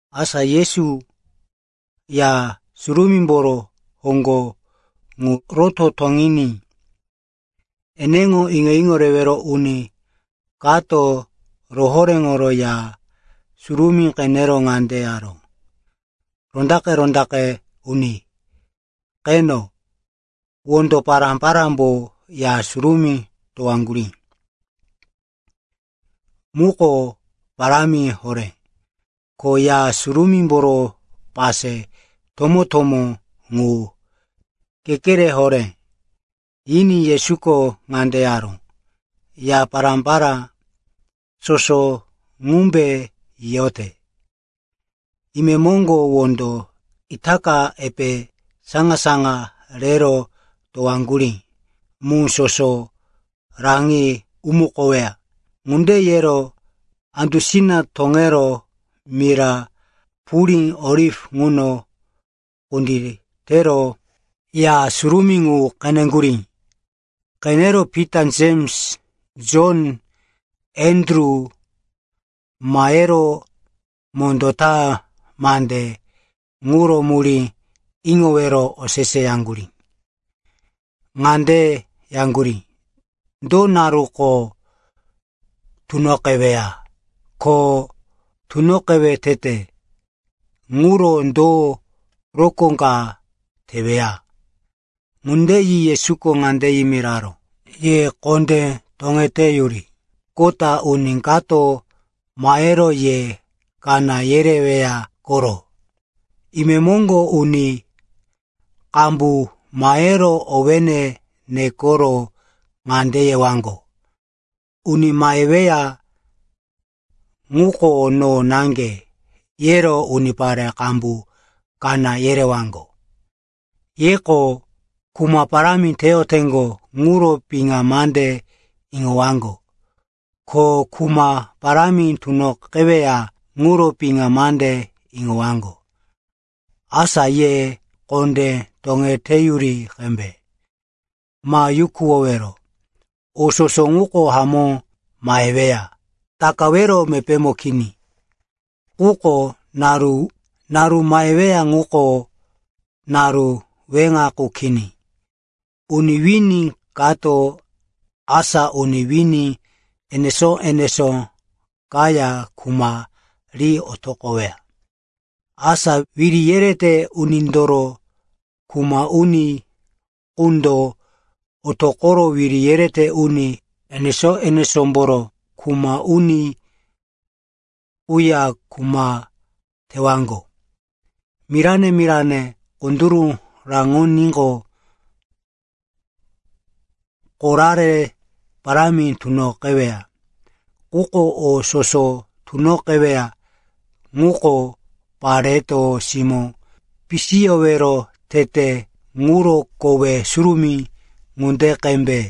Asa Yesu Ya Surumímboro hoŋgo ŋu roto toŋiní eneŋo iŋo-iŋo rewero uni kato rohoréŋoro Ya Surumí qenero ŋande yaró, “Rondaqe-rondaqe uni, qeno, wondo pará-parámbo Ya Surumí towaŋgurí muko parámi horé, ko Ya Surumímboro pase tomó-tomó ŋu kekere horé.” Yiní Yesuko ŋande yaró, “Ya pará-pará soso ŋumbe yiyote? Imemoŋgo wondo itaka epe saŋa-saŋa rero towaŋgurí mu soso raŋi umukoweya.” Ŋunde yero andusina toŋero mira purí Oliv ŋuno kunditero Ya Surumí ŋu qeneŋgurí. Qenero Pita, Jems, Jon, Andru mahero mondó ta mande ŋuro murí iŋowero oseseyaŋgurí. Ŋande yaŋgurí, “Do naruko tunoqeweya? Ko tunoqewe tete ŋuro do rokó ka teweya?” Ŋunde yi Yesuko ŋande yimiraró, “Ye kondé toŋeteyuri. Kota uni kato mahero ye kaná yereweya koro. Imemoŋgo uni qambu mahero owéne nekoro ŋande yewaŋgo, ‘Uni maheweya ŋuko no naŋge!’ yero unipare qambu kaná yerewaŋgo. Yeko kuma parámi teyoteŋgo ŋuro piŋa mande iŋowaŋgo, ko kuma parámi tunoqeweya ŋuro piŋa mande iŋowaŋgo. Asa ye kondé toŋeteyuri qembe. Ma yukuwowero. O soso ŋuko hamó maheweya, takawero mepémo kini. Quko naru maheweya ŋuko naru weŋa qu kini. Uni wini kato asa uni wini enesó-enesó kaya kuma ri otoqoweya. Asa wiri yerete unindoro kuma uni qundo otoqoro wiri yerete uni enesó-enesómboro kuma uni quya kuma tewaŋgo. Mirane-mirane kunduru raŋoníqo, korare parámi tunoqeweya. Quko o soso tunoqeweya ŋuko pareto simó pisiyowero tete ŋuro kowe surumí ŋunde qembe.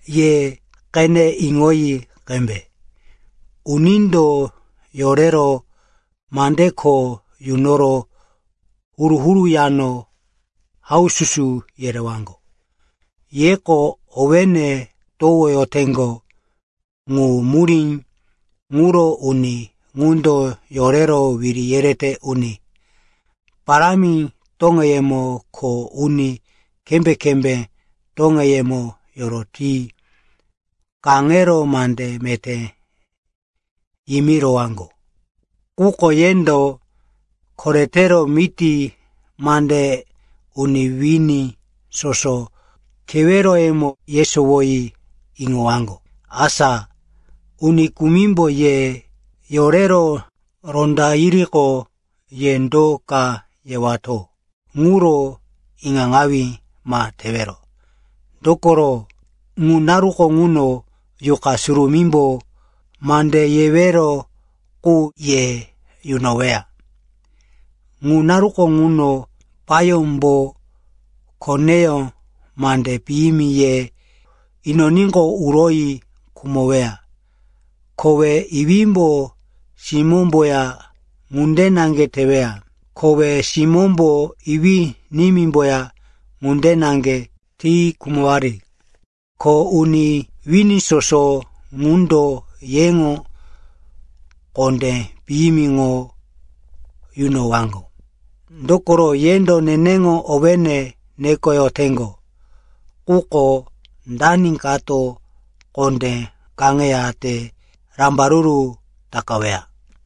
“Ye qene iŋoyi qembe. Unindo yorero mande kho yunoro huru-huru yano haususu yerewaŋgo. Yeko owéne towoyoteŋgo, ŋu murí ŋuro uni ŋundo yorero wiri yerete uni parámi toŋeyemo ko uni kembé-kembé toŋeyemo yoroti kaŋero mande meté yimirowaŋgo. Quko yendo koretero miti mande uni wini soso keweroyemo yesowoyi iŋowaŋgo. Asa uni kumimbo ye yorero ronda yiriqo, ye do ka yewato ŋuro iŋaŋawí ma tewero. Dokoro ŋu naruko ŋuno Yuqa Surumímbo mande yewero qu ye yunoweya. “Ŋu naruko ŋuno payómbo koneyó mande piyimi ye inoníqo, uroyi khumoweya. Kowe iwímbo simómboya ŋunde naŋge teweya. Kowe simómbo iwí-nimímboya ŋunde naŋge ti khumowari. Ko uni wini soso ŋundo yeŋo kondé piyimiŋo yunowaŋgo, dokoro yendo neneŋo owéne nekoyoteŋgo. Quko dani kato kondé kaŋeyate rambaruru takaweya.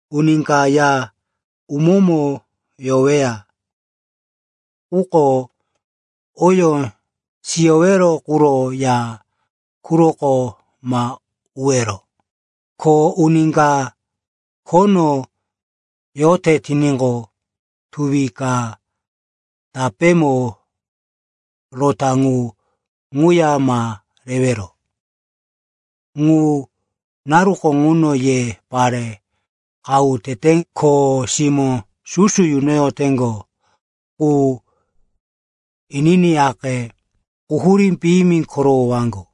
Uni ka ya umómo yoweya quko oyó siyowero quro ya quroko ma uwero. Ko uni ka khono yote tiníqo, tuwi ka tapémo rota ŋu ŋuya ma rewero. Ŋu naruko ŋuno ye pare qahu tete, ko simó susu yunoyoteŋgo qu, ininiyaqe, quhurí piyimi korowowaŋgo.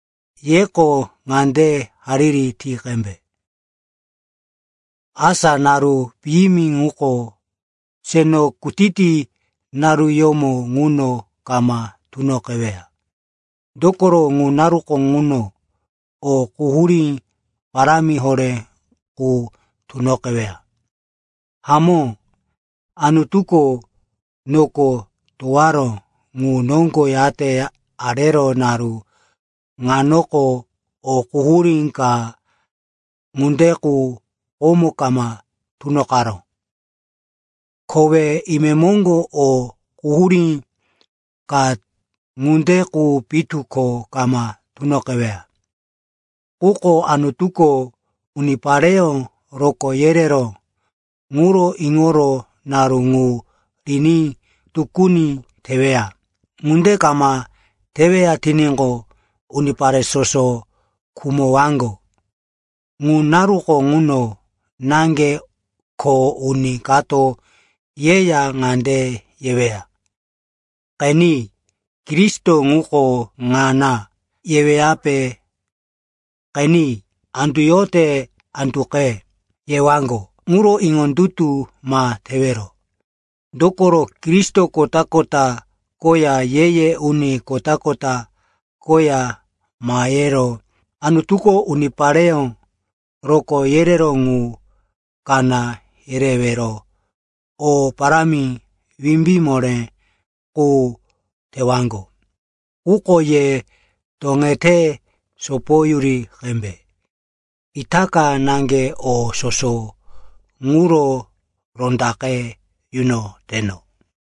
“Yeko ŋande hariri ti qembe, asa naru piyimi ŋuko seno kutiti naruyómo ŋuno kama tunoqeweya. Dokoro ŋu naruko ŋuno o quhurí parámi horé qu tunoqeweya. Hamó, Anutuko noko towaró ŋu noŋgo yate arero naru ŋanoko, o quhurí ka ŋunde qu komo kama tunoqaró. Kowe imemoŋgo o quhurí ka ŋunde qu pitu ko kama tunoqeweya. Quko Anutuko unipareyó rokó yereró ŋuro iŋoro naru ŋu riní tukuni teweya. Ŋunde kama teweya tiníqo, unipare soso khumowaŋgo. “Ŋu naruko ŋuno naŋge, ko uni kato yeya ŋande yeweya, ‘Qeni, Kristo ŋuko ŋana!’ yeweyape ‘Qeni, andu yote anduqe,’ yewaŋgo ŋuro iŋondutu ma tewero. Dokoro, Kristo kota-kota koya ye-ye uni kota-kota koya mahero Anutuko unipare rokó yereró ŋu kaná yerewero o parámi wimbí moré qu tewaŋgo. Quko ye toŋete sopoyuri qembe. Itaka naŋge o soso ŋuro rondaqe yunoteno.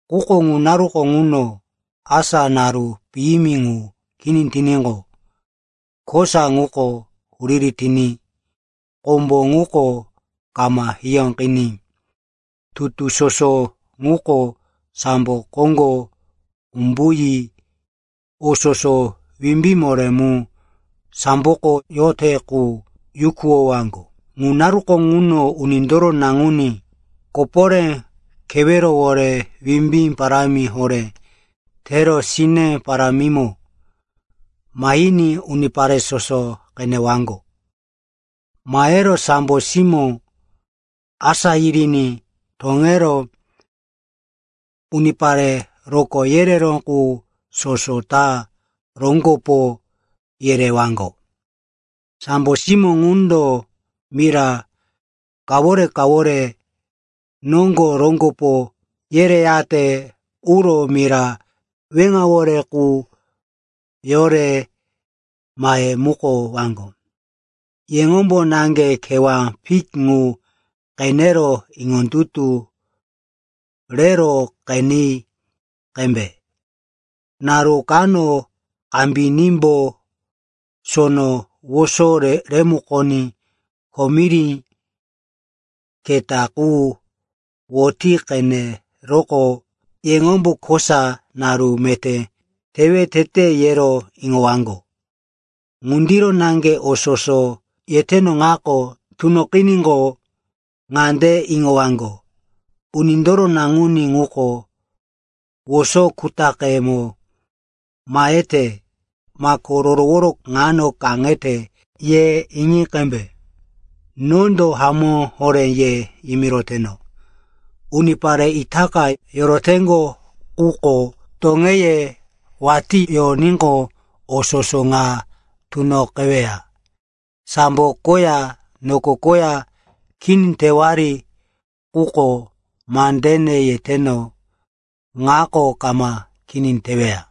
“Quko ŋu naruko ŋuno, asa naru piyimi ŋu kini tiníqo, “‘kosa ŋuko huriri tiní kombo ŋuko kama hiyóqiní tutu soso ŋuko sambo koŋgo umbuyi o soso wimbí moré mu samboko yote qu yukuwowaŋgo.’ “Ŋu naruko ŋuno Unindoro Naŋuní koporé kewerowore wimbí parámi horé tero sine parámimo mahiní unipare soso qenewaŋgo. Mahero sambo simó asá yiriní toŋero unipare rokó yereró qu soso ta roŋgopo yerewaŋgo. Sambo simó ŋundo mira kawore-kawore noŋgo roŋgopo yereyate uro mira weŋawore qu yore mahemukowaŋgo. “Yeŋombo naŋge kewá fik ŋu qenero iŋondutu rero qeni qembe. Naru kano kambinímbo sono woso remukoní komiri keta qu woti qeneroqo, yeŋombo, kosa naru meté tewe tete, ye iŋowaŋgo. Ŋundiro naŋge o soso yeteno ŋako tunoqiníqo, ŋande iŋowaŋgo, Unindoro Naŋuní ŋuko woso kutaqemo mahete, mako rorowo ŋano kaŋete, ye iŋi qembe. Nondo hamó horé ye yimiroteno, unipare itaka yoroteŋgo quko toŋeye watí yoníqo, o soso ŋa tunoqeweya. Sambo koya noko koya kini tewari, quko mande yeteno ŋako kama kini teweya.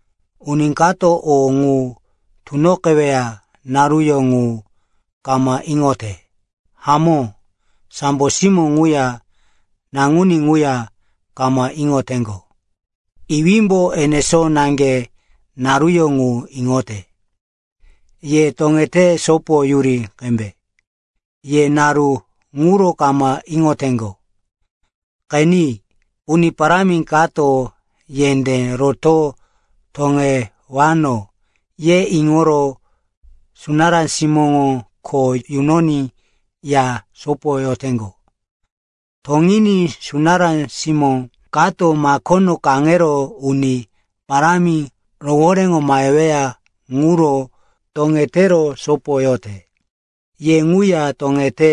“Uni kato o ŋu tunoqeweya naruyó ŋu kama iŋote. Hamó, sambo simó ŋuya Naŋuní ŋuya kama iŋoteŋgo. Iwímbo enesó naŋge naruyó ŋu iŋote. “Ye toŋete sopoyuri qembe. Ye naru ŋuro kama iŋoteŋgo. Qeni, uni parámi kato, yendé roto toŋewano, ye iŋoro sunará simóŋo kho yunoní ya sopoyoteŋgo. Toŋiní sunará simó kato makono kaŋero uni parámi rohoréŋo maheweya ŋuro toŋetero sopoyote. “Ye ŋuya toŋete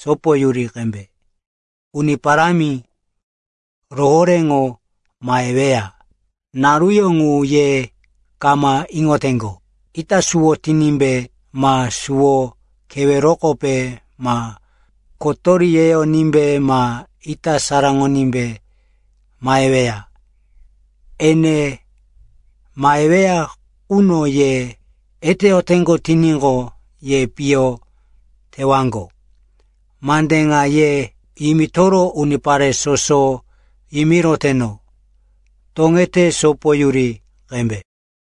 sopoyuri qembe. Uni Parámi rohoréŋo maheweya naruyó ŋu ye kama iŋoteŋgo. Ita suwo tinímbe ma suwo kewerokope ma kotori yeyonímbe ma ita saraŋoní maheweya. Ene maheweya quno ye eteyoteŋgo tiníqo, ye piyo tewaŋgo. Mande ŋa ye yimitoro unipare soso yimiroteno, ‘Toŋete sopoyuri qembe.’”